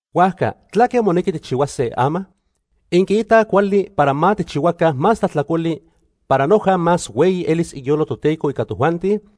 ¿Huajca tlaque monequi tijchihuase ama? ¿Inquiitaj cuali para ma tijchihuaca más tlajtlacoli para noja más hueyi elis iyolo Toteco ica tojuanti?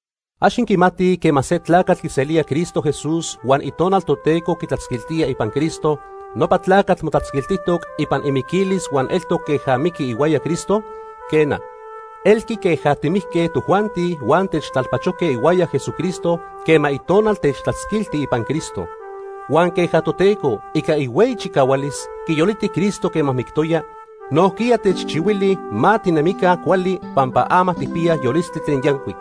¿Ax inquimatij quema se tlacatl quiselía Cristo Jesús huan Itonal Toteco quitlatzquiltía ipan Cristo, nopa tlacatl motlatzquilijtoc ipan imiquilis huan eltoc queja mijqui ihuaya Cristo? Quena, elqui queja timijque tojuanti huan techtlalpachojque ihuaya Jesucristo quema Itonal techtlatzquilti ipan Cristo. Huan queja Toteco, ica ihueyi chicahualis, quiyoliti Cristo quema mictoya, nojquiya techchihuili ma tinemica cuali pampa ama tijpiyaj yolistli tlen yancuic.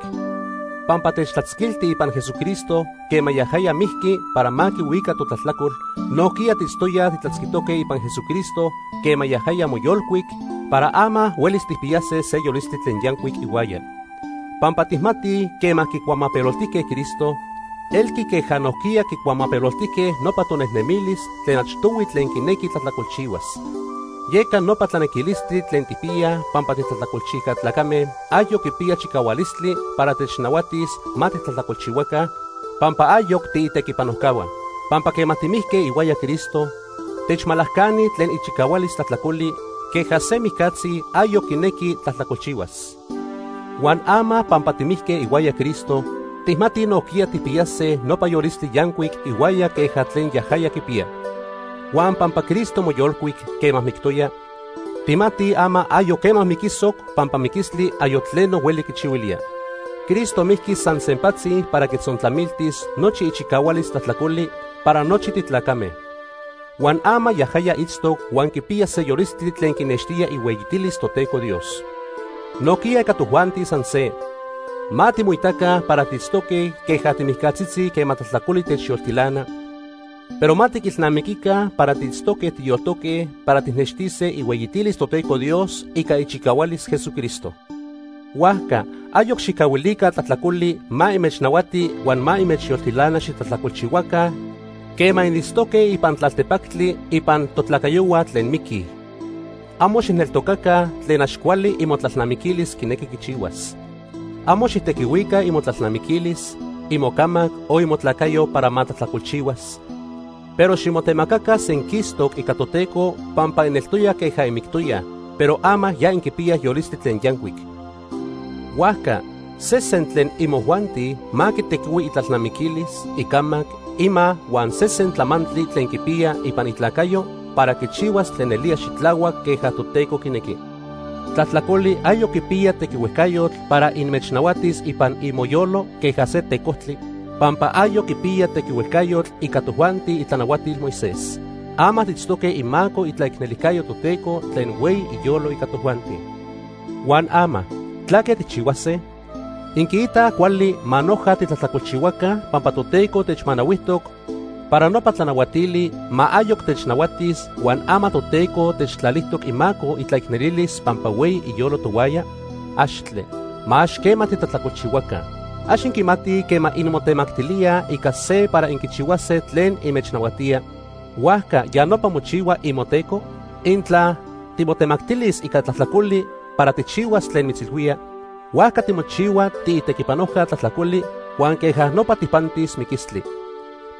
Pampa techtlatzquiltij ipan Jesucristo quema yajaya mijqui para ma quihuica totlajtlacol, nojquiya tiitztoyaj titlatzquitoque ipan Jesucristo quema yajaya moyolcuic para ama huelis tijpiyase se yolistli tlen yancuic ihuaya. Pampa tijmatij quema quicuamapeloltijque Cristo, elqui queja nojquiya quicuamapeloltijque nopa tonejnemilis tlen achtohui tlen quinequi tlajtlacolchihuas. Yeca nopa tlanequilistli tlen tijpiyaj pampa titlajtlacolchijca tlacame, ayoc quipiya chicahualistli para technahuatis ma titlajtlacolchihuaca, pampa ayoc tiitequipanojcahua. Pampa quema timijque ihuaya Cristo, techmalacani tlen ichicahualis tlajtlacoli queja se mijcatzi ayoc quinequi tlajtlacolchihuas. Huan ama pampa timijque ihuaya Cristo, tijmatij nojquiya tijpiyase nopa yolistli yancuic ihuaya queja tlen yajaya quipiya. Huan pampa Cristo moyolcuic quema mictoya, tijmatij ama ayoc quema miquisoc pampa miquistli ayoc tleno hueli quichihuilía. Cristo mijqui san sempatzi para quitzontlamiltis nochi ichicahualis tlajtlacoli para nochi titlacame. Huan ama yajaya itztoc huan quipiya se yolistli tlen quinextía ihueyitilis Toteco Dios. Nojquiya ica tojuanti san se. Ma timoitaca para tiitztoque queja timijcatzitzi quema tlajtlacoli techyoltilana, pero ma tiquilnamiquica para tiitztoque tiyoltoque para tijnextise ihueyitilis Toteco Dios ica ichicahualis Jesucristo. Huajca ayoc xijcahuilica tlajtlacoli ma inmechnahuati huan ma inmechyoltilana xitlajtlacolchihuaca quema initztoque ipan tlaltepactli ipan totlacayohua tlen miquij. Amo xijneltocaca tlen ax cuali imotlalnamiquilis quinequi quichihuas. Amo xijtequihuica imotlalnamiquilis, imocamac o imotlacayo para ma tlajtlacolchihuas, pero ximotemacaca senquistoc ica Toteco pampa ineltoyaj queja inmictoyaj, pero ama ya inquipiyaj yolistli tlen yancuic. Huajca sesen tlen imojuanti ma quitequihui itlalnamiquilis, icamac, ima huan sesen tlamantli tlen quipiya ipan itlacayo para quichihuas tlen nelía xitlahuac queja Toteco quinequi. Tlajtlacoli ayoc quipiya tequihuejcayotl para inmechnahuatis ipan imoyolo queja se tecojtli, pampa ayoc quipiyaj tequihuejcayotl ica tojuanti itlanahuatil Moisés. Ama tiitztoque imaco itlaicnelijcayo Toteco tlen hueyi iyolo ica tojuanti. Huan ama ¿tlaque tijchihuase? ¿Inquiitaj cuali ma noja titlajtlacolchihuaca pampa Toteco techmanahuijtoc para nopa tlanahuatili ma ayoc technahuatis huan ama Toteco techtlalijtoc imaco itlaicnelilis pampa hueyi iyolo tohuaya? ¡Axtle! Ma ax quema titlajtlacolchihuaca. ¿Ax inquimatij quema inmotemactilíaj ica se para inquichihuase tlen inmechnahuatía, huajca ya nopa mochihua imoteco? Intla timotemactilis ica tlajtlacoli para tijchihuas tlen mitzilhuía, huajca timochihua tiitequipanojca tlajtlacoli huan queja nopa tijpantis miquistli.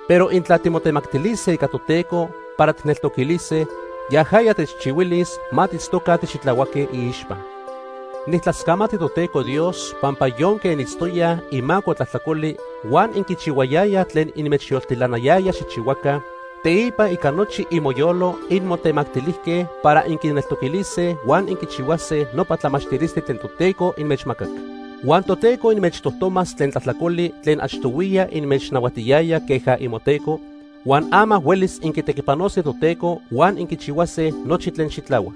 Pero intla timotemactilise ica Toteco para tijneltoquilise, yajaya techchihuilis ma tiitztoca tixitlahuaque iixpa. Nijtlascamati Toteco Dios pampa yonque initztoyaj imaco tlajtlacoli huan inquichihuayayaj tlen inmechyoltilanayaya xijchihuaca, teipa ica nochi imoyolo inmotemactilijque para inquineltoquilise huan inquichihuase nopa tlamachtilistli tlen Toteco inmechmacac. Huan Toteco inmechtojtomas tlen tlajtlacoli tlen achtohuiya inmechnahuatiyaya queja imoteco, huan ama huelis inquitequipanose Toteco huan inquichihuase nochi tlen xitlahuac.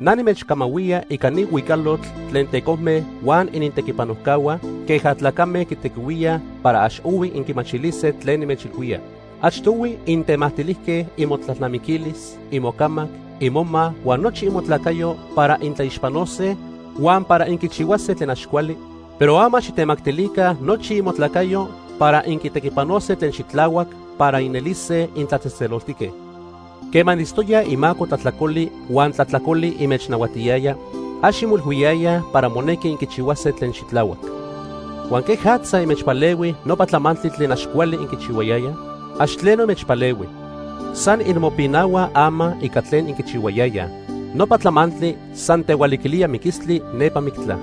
Na nimechcamahuía ica ni huicalotl tlen tecojme huan inintequipanojcahua queja tlacame quitequihuíaj para ax ohui inquimachilise tlen nimechilhuía. Achtohui intemactilijque imotlalnamiquilis, imocamac, imoma huan nochi imotlacayo para intlaixpanose huan para inquichihuase tlen ax cuali, pero ama xijtemactilica nochi imotlacayo para inquitequipanose tlen xitlahuac para inelise intlatzejtzeloltique. Quema initztoyaj imaco tlajtlacoli huan tlajtlacoli inmechnahuatiyaya, ax inmoilhuiyayaj para monequi inquichihuase tlen xitlahuac. Huan ¿quejatza inmechpalehui nopa tlamantli tlen ax cuali inquichihuayayaj? Ax tleno inmechpalehui. San inmopinahuaj ama ica tlen inquichihuayayaj. Nopa tlamantli san tehualiquilía miquistli nepa mictla.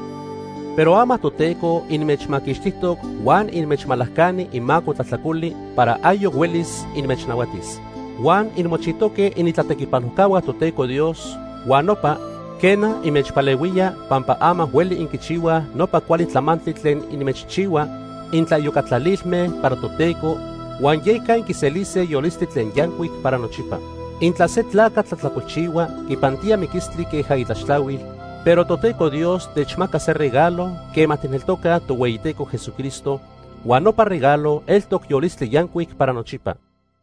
Pero ama Toteco inmechmaquixtijtoc huan inmechmalacani imaco tlajtlacoli para ayoc huelis inmechnahuatis. Huan inmochijtoque initlatequipanojcahua Toteco Dios huan nopa, quena, inmechpalehuía pampa ama hueli inquichihuaj nopa cuali tlamantli tlen inmechchihua intlaiyocatlalilme para Toteco huan yeca inquiselise yolistli tlen yancuic para nochipa. Intla se tlacatl tlajtlacolchihua, quipantía miquistli queja itlaxtlahuil, pero Toteco Dios techmaca se regalo quema tijneltocaj Tohueyiteco Jesucristo, huan nopa regalo eltoc yolistli yancuic para nochipa.